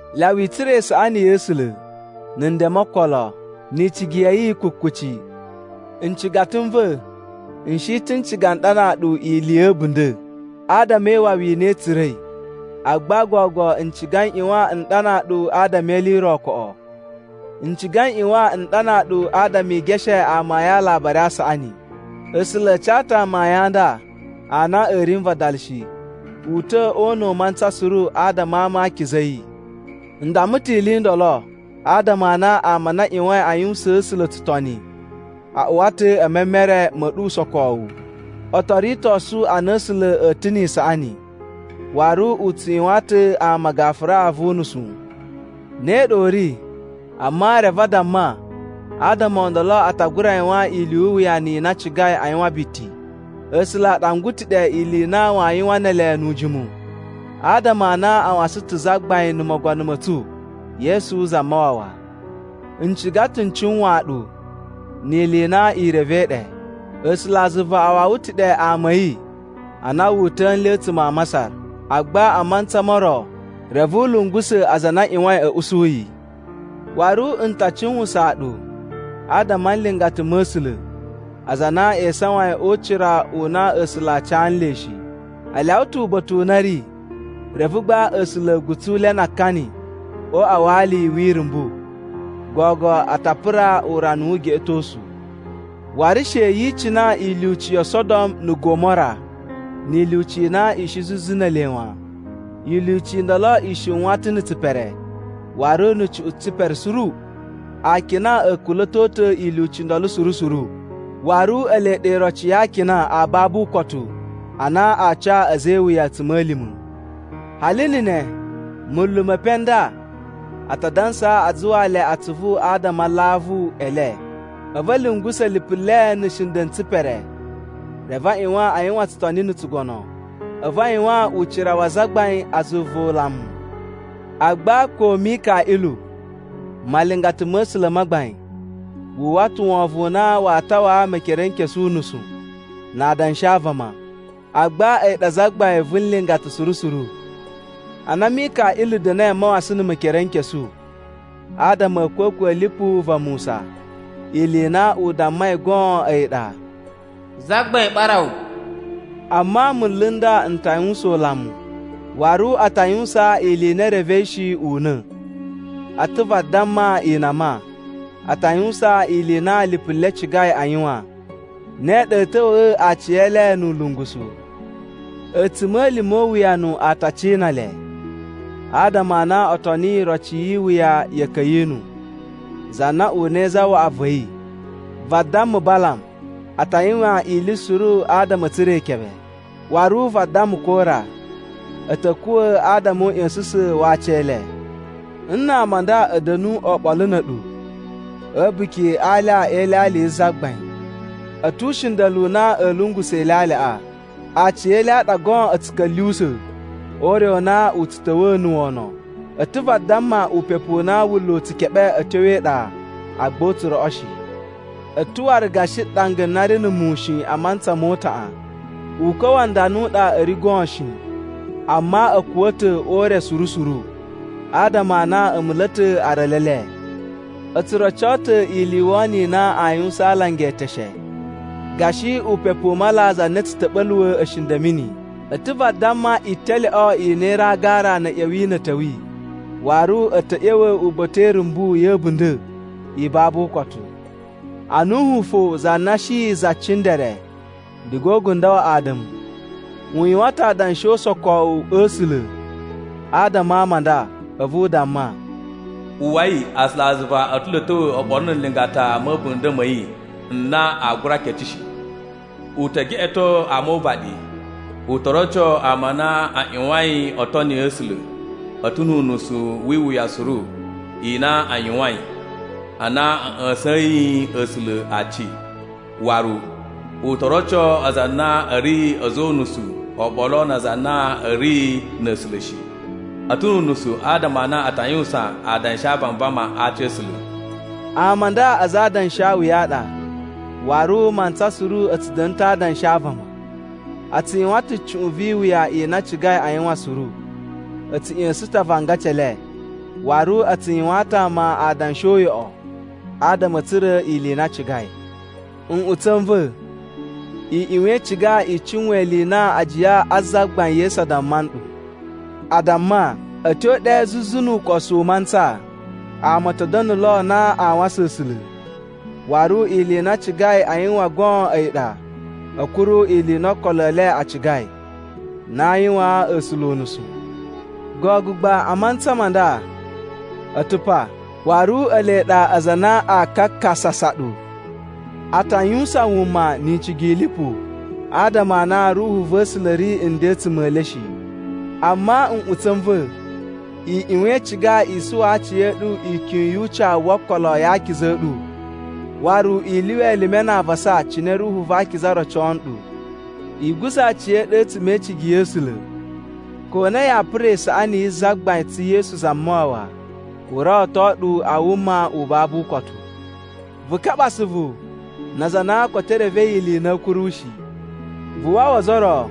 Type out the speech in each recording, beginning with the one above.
Lyawa i tsura̱ isaꞌani ya̱ A̱sula̱, na̱ nden mo okolo, ni icigi ya̱ yi kukuci. Ncigata n va̱, n shi ta̱ n ciga n ɗanaa ɗu ili ya̱ a̱bunda̱ adama e iwawi i na tsu tsura̱i. Agba gogo n ciga n ꞌyuwan n ɗanaa ɗu adama e ili i ro koꞌo. N ciga n ꞌyuwan n ɗanaa ɗu adama i geshe amayun a Alabari a Saꞌani. A̱sula̱ a ca ta̱ amayun a nda a na a̱ ri n vadala shi u ta̱ o una̱ u mantsa suru adama a ama a akiza a̱ yi. N damma ta̱ ili i ndolo adama a na ama a na a ꞌyuwain a yuwusaan A̱sula̱ tsutoni a uwa ta̱ e memere ma̱ ɗu usokowu. O to ritosu a na A̱sula̱ a̱ ta̱ ni isaꞌani waru u tsu yuwaan ta̱ ama gafura vu unusu. Ne ɗa u ri, amma reve a damma adama o ndolo a ta gura yuwan ili yu uwuyanu i na a cigai a yuwan biti. A̱sula̱ a ɗangwa ta̱ ɗe ili i na waa yuwan ne ele nu ujimu adama a na a wasan ta̱ Zagbain na̱ Mogono ma̱ tsu, Yesu Zamawawa. N ciga ta̱ n cuwaan ɗu ni ili i na i revei ɗe: A̱sulazuva a wawa ta̱ ɗe ama a̱ yi a na wu uta̱a̱ nle a̱tsuma̱ a Masar. Agba a mantsa mo ro reve u lungusa̱ aza a na a ꞌyuwain a̱ usu yi. Waru n ta cuwusaan ɗu adama a nlingata ma̱ A̱sula̱ aza a na e isawain o ucira u na A̱sula̱ a ca nle shi. A lyawa ta̱ uba̱ta̱ u na a̱ ri, reve gba A̱sula̱ a̱ gutsu le na akani o uꞌwa wa ali wi irumbu. Gogo a ta pura urana wu ugeꞌetosu. Waru she yi icina ilyuci yo Sodom na̱ Gomora, ni ilyuci i na i shi zuzu ne ele wan. Ilyuci i ndolo i shiwan ta̱ na̱ tsipere waru na̱ cuꞌun tsipere suru. Akina a̱ kula̱to ta̱ ilyuci i ndolo suru suru, waru ele ɗa iroci ya akina a babu ukotu a na aa ca a̱za̱ e iwuya a̱tsuma̱lima̱. Hali na̱ ne, munlu me epen n nda a ta dansa a zuwaa le atsuvu adama a alavu e le. A̱vu a̱ lungusa̱ lipu le na̱ nshinda̱ n tsipere. Reve a ꞌyuwan a yuwan tsutoni na̱ tsugono, a̱vu a yuwaan ucira wa azagbain a zuva ulamu. Agba ko Mikaꞌilu malingata ma̱ A̱sula̱ ma gbain wu uwwa ta̱ wovon u na waa tawaa Mekerenkesu unusu na adanshi a vama, agba a̱yi ɗa zagbain vu nlingata suru suru. Ana Mikaꞌilu da̱na̱i a mawasan na̱ Mekerenkesu adama a̱ a̱a̱kwa̱kwa̱ a̱ lipu va Musa, ili i na u dammai goon a̱yi ɗa, “Zagbain ɓara wu.” Amma munlu n nda n ta yuwusan ulamu, waru a ta yuwusaan ili i na e revei shi una̱. A̱ ta̱ vadamma inama. A ta yuwusan ili i na lipu le cigai a yuwan, ne ɗa a̱a̱ ta̱wa̱a̱ aciyele nu ulungusu. A̱tsuma̱lima̱ o uwuyanu a ta cina le! Adama a na o toniyi iroci yi iwuya ya̱ Ka̱yinu, za na unai zawaꞌa va̱ yi. Vadamma Balam, a ta yuwan ili suru adama a̱ tsura̱ ikebe. Waru vadamma Kora, a̱ ta̱ kuwa̱ adama o uꞌya̱sa̱sa̱n wa aci e le. Nna ama a nda a̱ da̱nu oɓolo na̱ a̱ɗu a̱ a̱buki a alya e ilyalya yi Zagbain, a̱ tu ushinda̱lu u na a̱a̱ lungusa̱ ilyalyaꞌa. Aciyele a ɗa goon a̱ tsu ka̱lyuwusa̱ o ure u na u tsu ta̱wa̱a̱ na̱ wono. A̱ ta̱ vadamma upepu u na wunla̱ u tsu keɓe a̱ tyo e iɗa agba u tsu roꞌo shi. A̱ ta̱ waru gashi ɗanga na ri na̱ muwun shi a mantsa mo utaꞌan. Ukwa̱ wa ndana u ɗa a̱ ri goon shi, amma a̱ kuwa̱ ta̱ o ure suru suru, adama a na a̱ mula̱ ta̱ aralu e le. O tsu roco ta̱ ili i wono i na aa yuwusan a alanga eteshe gashi upepu u mala za na tsu ta̱ɓa̱luwa̱ a̱shinda̱ a̱ mini. A̱ ta̱ vadamma italyoꞌo i na i ri a agara na̱ a̱ ꞌya̱wi na̱ a̱ ta̱wi, waru a̱ ta̱ ꞌya̱wa̱ uba̱ta̱ e irumbu ya̱ a̱bunda̱ i babu ukotu. Anuhu fo za na shi za cindere diga o ugundo wa Ada̱mu, u yuwan ta̱ adanshi o usokowu a̱ A̱sula̱ adama a ama a nda, a̱vu u damma, “Uwwai, A̱sulazuva a̱ ta̱ lo a̱ ta̱wa̱ oɓolo na̱ nlingata ma̱ a̱bunda̱ ma̱ yi n na aa gura kece shi. U te geꞌeto ama o uvaɗi. U to roco ama a na a ꞌyuwain o toni A̱sula̱ a̱ ta̱ nu unusu wi iwuya suru i na a yuwain a na a̱ ꞌya̱sa̱yin A̱sula̱ aci. Waru u to roco aza a na a̱ ri a̱za̱ o unusu oɓolo na aza a na a̱ ri na̱ A̱sula̱ shi, a̱ ta̱ nu unusu adama a na a ta yuwusan adanshi a vanvama a aci a̱ A̱sula̱.” Ama a nda aza a adanshawuya a ɗa, waru mantsa suru a̱ tsu da̱na̱ ta̱ a adanshi a vama. A tsu yuwan ta̱ cuꞌun vi iwuya i na a cigai a yuwan suru. A̱ tsu ꞌya̱sa̱sa̱n ta̱ avangaci e le, waru a tsu yuwaan ta̱ ama adanshi uyoꞌo adama a̱ tsura̱ ili i na a cigai. Nꞌutsa̱ n va̱, i ꞌyuwan i ciga i cuwan ili i na ajiya a Zagbain Yesu a damma nɗu. A damma, “A̱ tyo ɗe zuzu nu ukosu u mantsa, ama a̱ ta̱ da̱na̱ lo na aa wasan A̱sula̱, waru ili i na aa ciga a yuwan goon a̱yi ɗa, a̱a̱ kuru ili i na okolo e le a cigai na aa yuwaan A̱sula̱ unusu.” Gogo gba a mantsa ma nda, a̱ ta̱ pa, waru ele ɗa aza a na aa kakasasa ɗu. A ta yuwusan wuma ni icigi i lipu adama a na Ruhu va̱ A̱sula̱ ri nden a̱tsuma̱ e le shi. Amma nꞌutsa̱ n va̱, i ꞌyuwan i ciga i suwa aciya̱ɗu e ikyun yu ucawu wo okolo ya akiza a̱ ɗu. Waru i lyuwa elime na avasa cine Ruhu va Akiza rocoo nɗu. I guza̱ aciya̱ɗu a̱tsuma̱ e icigi ya̱ A̱sula̱ ko na yaa pura isaꞌani yi Zagbain tsu Yesu Zamawawa u rawato ɗu a wuma u babu ukotu. Vu kaɓa asuvu na aza a na koto e revei ili i na a̱a̱ kuru shi. Vu wawa ozo o ro,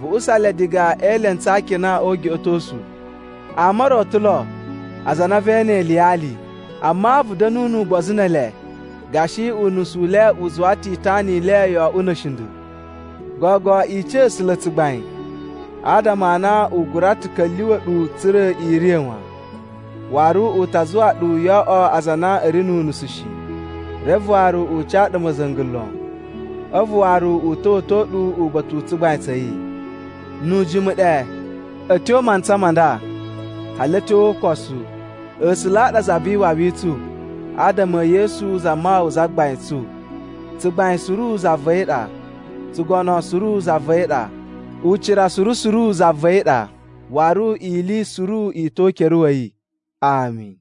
vu usa le diga e elentsu a akina o ugeꞌetosu. Ama o ro a̱ ta̱ lo aza a na vee ene iliyali, amma vu da̱nu nu ugbozu ne ele gashi unusu u le u zuwa ta̱ itana i le yo oꞌwo na̱ a̱shinda̱. Gogo, i ca A̱sula̱ tsugbain, adama a na u gura ta̱ ka̱lyuwa̱ ɗu tsa̱ra̱ i riya̱ wan, waru u ta zuwa ɗu yo oꞌwo aza a na a̱ ri nu unusu shi, reve waru u ca ɗu ma̱za̱nga̱ lon. A̱vu waru u ta̱wa̱to ɗu uba̱ta̱ u tsugbain tsa̱ yi. Nu ujimu ɗe, a̱ tyo mantsa ma nda, hali a̱ tyo o ukosu, A̱sula̱ a ɗa Za vi Iwawi i tsu adama e Yesu Zamawawa Zagbain tsu. Tsugbain suru za va̱ yi ɗa. Tsugono suru za va̱ yi ɗa. Ucira suru suru za va̱ yi ɗa. Waru ili suru i ta̱ o ukere wa̱ yi. Ami.